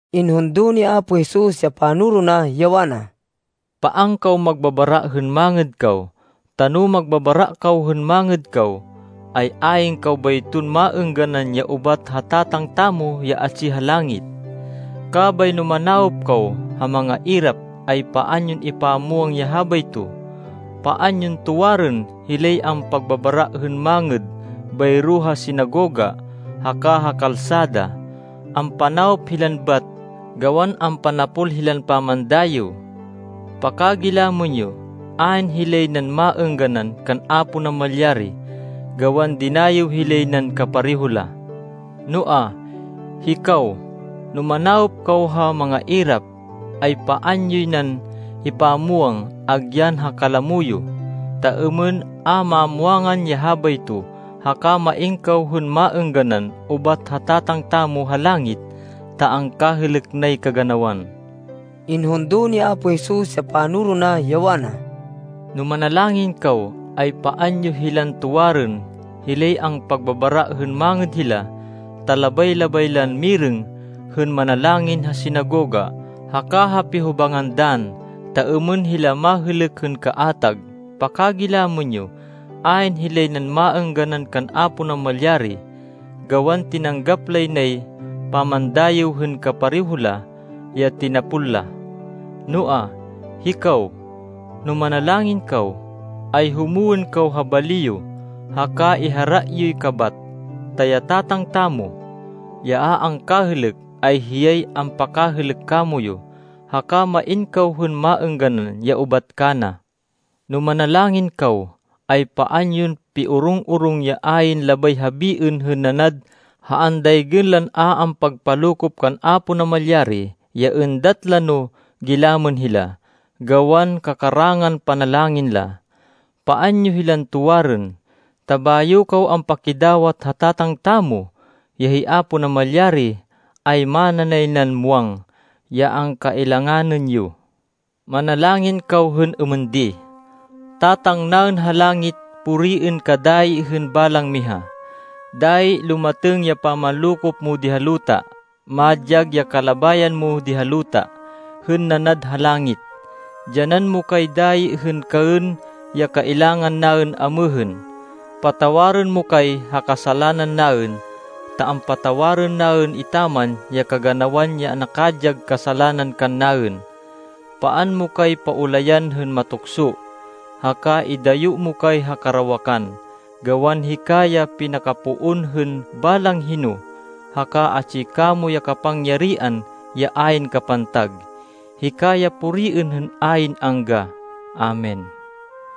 Inhundo ni Apo Jesus ya panoro na, ya wana, “Paan kaw magbabara hên mangêd kaw, ta no magbabara kaw hên mangêd kaw, ay ayn kaw bayton maêngganan ya ubat ha Tatang tamo ya atsi ha langit. “Kabay no manawop kaw ha mangairap, ay paan yon ipamwang ya habayto. Paan yon tuwarên hilay ampagbabara hên mangêd bayro ha sinagoga haka ha kalsada. Ampanawop hilan bat gawan ampanapol hilan pamandayêw. Pakagilamên yo, ayn hilay nan maêngganan kan Apo Namalyari, gawan dinayêw hilay nan kapareho la. Noa, hikaw, no manawop kaw ha mangairap, ay paan yoy nan ipamwang agyan ha kalamo yo, ta êmên a mamwangan ya habayto, haka main kaw hên maêngganan ubat ha Tatang tamo ha langit ta angkahêlêk nay kaganawan.” Inhundo ni Apo Jesus ya panoro na, ya wana, “No manalangin kaw, ay paan yo hilan tuwarên hilay ampagbabara hên mangêd hila, ta labay-labay lan mirêng hên manalangin ha sinagoga haka ha pihobangan dann, ta êmên hila mahêlêk hên kaatag. Pakagilamên yo, ayn hilay nan maêngganan kan Apo Namalyari, gawan tinanggap lay nay pamandayêw hên kapareho la, ya tinapol la. Noa, hikaw, no manalangin kaw, ay humwên kaw ha bali yo haka ihara yoy kabat, ta ya Tatang tamo, ya a angkahêlêk, ay hiyay ampakahêlêk kamoyu, haka main kaw hên maêngganan ya ubat kana. “No manalangin kaw, ay paan yon piorong-orong ya ayn labay habiên hên nanad ha andaygên lan a ampagpalokop kan Apo Namalyari ya êndat la no gilamên hila, gawan kakarangan panalangin la. Paan yo hilan tuwarên, ta bayo kaw ampakidawat ha Tatang tamo, ya hi Apo Namalyari, ay mana nay nan muwang ya angkailanganên yo. “Manalangin kaw hên êmên di: ‘Tatang naên ha langit, puriên ka dayi hên balang miha. Dayi lumatêng ya pamanlokop mo di ha luta. Madyag ya kalabayan mo di ha luta, hên nanad ha langit. Dyanan mo kay dayi hên kaên ya kailangan naên amêhên. Patawarên mo kay ha kasalanan naên ta ampatawarên naên etaman ya kaganawan ya nakadyag kasalanan kannaên. Paan mo kay paulayan hên matukso, haka idayo mo kay ha karawakan. Gawan hika ya pinakapoon hên balang hino, haka atsi kamo ya kapangyarihan ya ayn kapantag. Hika ya puriên hên ayn angga! Amen.’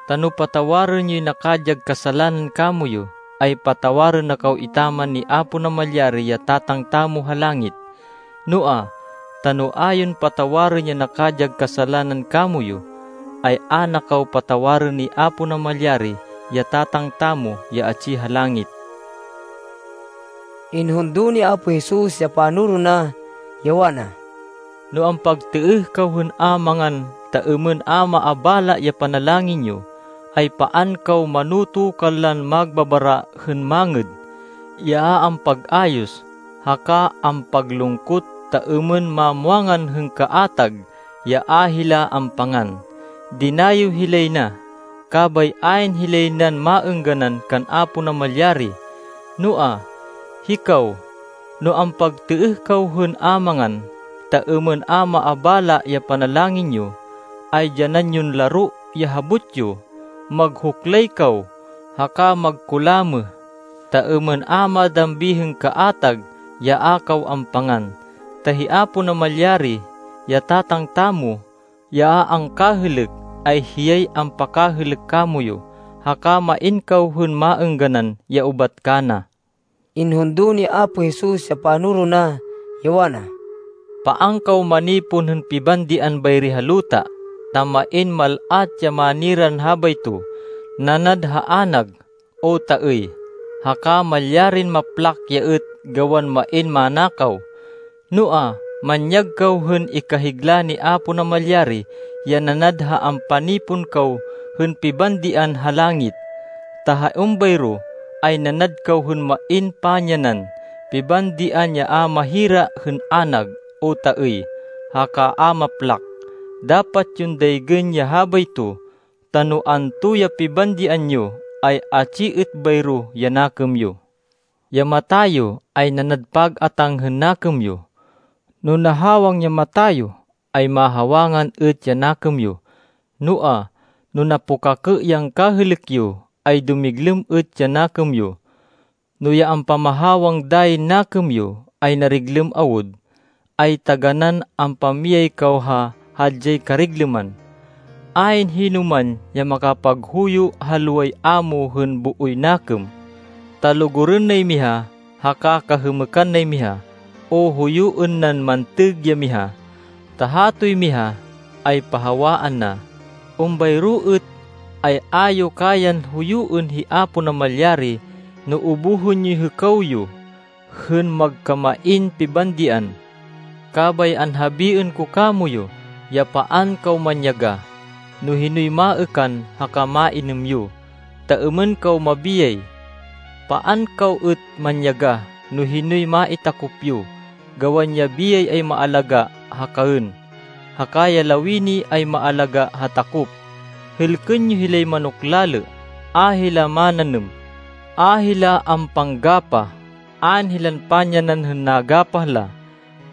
Ta no patawarên yoy nakadyag kasalanan kamoyu, ay patawarên na kaw etaman ni Apo Namalyari ya Tatang tamo ha langit. Noa, ta no a yon patawarên ya nakadyag kasalanan kamoyu, ay a na kaw patawarên ni Apo Namalyari, ya Tatang tamo ya atsi ha langit.” Inhundo ni Apo Jesus ya panoro na, ya wana, “No ampagtêêh kaw hên a mangan, ta êmên a maabala ya panalangin yo, ay paan kaw manoto kanlan magbabara hên mangêd, ya a ampag-ayos, haka ampaglungkot, ta êmên mamwangan hên kaatag ya a hila ampangan. Dinayêw hilay na, kabay ayn hilay nan maêngganan kan Apo Namalyari. Noa, hikaw, no ampagtêêh kaw hên a mangan, ta êmên a maabala ya panalangin yo, ay dyanan yon laro ya habot yo, maghuklay kaw haka magkulamêh, ta êmên a madambi hên kaatag ya a kaw ampangan, ta hi Apo Namalyari, ya Tatang tamo, ya a angkahêlêk, ay hiyay ampakahêlêk kamoyu, haka main kaw hên maêngganan ya ubat kana.” Inhundo ni Apo Jesus ya panoro na, ya wana, “Paan kaw manipon hên pibandian bayri ha luta, ta main mal-at ya maniran habayto, nanad ha anag, o taêy. Haka malyarin maplak ya êt gawan main manakaw. Noa, manyag kaw hên ikahigla ni Apo Namalyari ya nanad ha ampanipon kaw hên pibandian ha langit, ta ha êmbayro ay nanad kaw hên main pamyanan pibandian ya a mahira hên anag, o taêy, haka a maplak. Dapat yon daygên ya habayto, ta no anto ya pibandian yo, ay atsi êt bayro ya nakêm yo.” “Ya mata yo ay nanad pag-atáng hên nakêm yo. No nahawang ya mata yo, ay mahawangan êt ya nakêm yo. Noa, no napukakê ya angkahêlêk yo, ay dumiglêm êt ya nakêm yo. No ya ampamahawang dayin nakêm yo, ay nariglêm awud, ay taganán ampamiyay kaw ha hadyay kariglêman.” “Ayn hinoman ya makapaghuyo ha loway amo hên booy nakêm. Ta lugurên nay miha, haka kahêmêkan nay miha, o huyuên nan mantêg ya miha, ta hatoy miha, ay pahawaan na. Êmbayro êt, ay a yo kayan huyuên hi Apo Namalyari no ubuhên yoy hêkaw yo hên magkamain pibandian. “Kabay anhabiên ko kamoyu ya paan kaw manyagah, no hinoy maêkan haka mainêm yo, ta êmên kaw mabiyay. Paan kaw êt manyagah no hinoy maitakop yo. Gawan ya biyay ay maalagá ha kaên, haka ya lawini ay maalagá ha takop. Hêlkên yo hilay manok lalê, a hila mananêm, a hila ampanggapah, ayn hilan pamyanan hên nagapah la.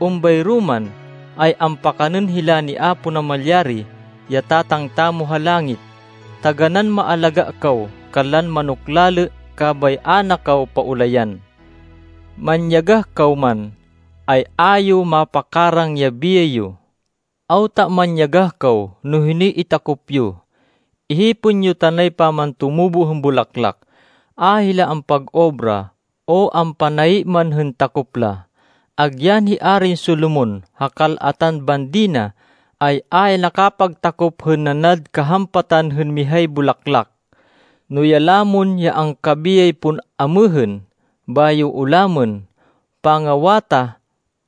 Êmbayro man, ay ampakanên hila ni Apo Namalyari, ya Tatang tamo ha langit. Taganán maalagá kaw kanlan manok lalê kabay a na kaw paulayan! Manyagah kaw man, ay a yo mapakarang ya biyay yo! “Awta manyagah kaw no hinoy itakop yo! Ihipên yo tanay pamantumubo hên bulaklak. A hila ampag-obra o ampanayi man hên takop la. Agyan hi Arin Solomon, ha kal-atan bandi na, ay a ya nakapagtakop hên nanad kahampatan hên mihay bulaklak. No ya lamon, ya angkabiyay pon amêhên, bayo ulamên pangawatah,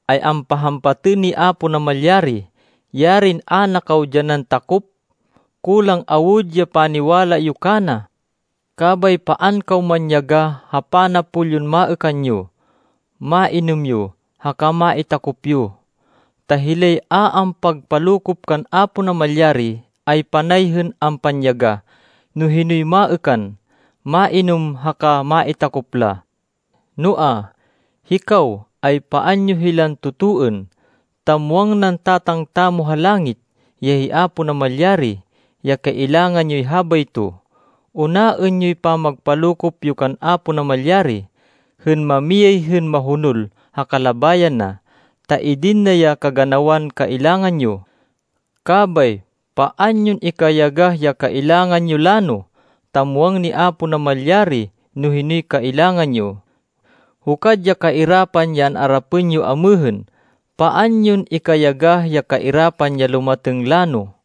ay ampahampatên ni Apo Namalyari, yarin a na kaw dyanan takop! Kulang awud ya paniwala yo kana. Kabay paan kaw manyagah ha panapol yon maêkan yo, mainêm yo haka maitakop yo. Ta hilay a ampagpalokop kan Apo Namalyari, ay panay hên ampanyagah no hinoy maêkan, mainêm haka maitakop la. Noa, hikaw, ay paan yo hilan totoên, ta muwang nan Tatang tamo ha langit, ya hi Apo Namalyari, ya kailangan yoy habayto. Unaên yoy pagpalokop yo kan Apo Namalyari, hên mamiyay hên mahonol ha kalabayan na, ta idin na ya kaganawan kailangan yo. Kabay paan yon ikayagah ya kailangan yo lano, ta muwang ni Apo Namalyari no hinoy kailangan yo. Hukad ya kairapan ya an-arapên yo amêhên. Paan yon ikayagah ya kairapan ya lumatêng lano.”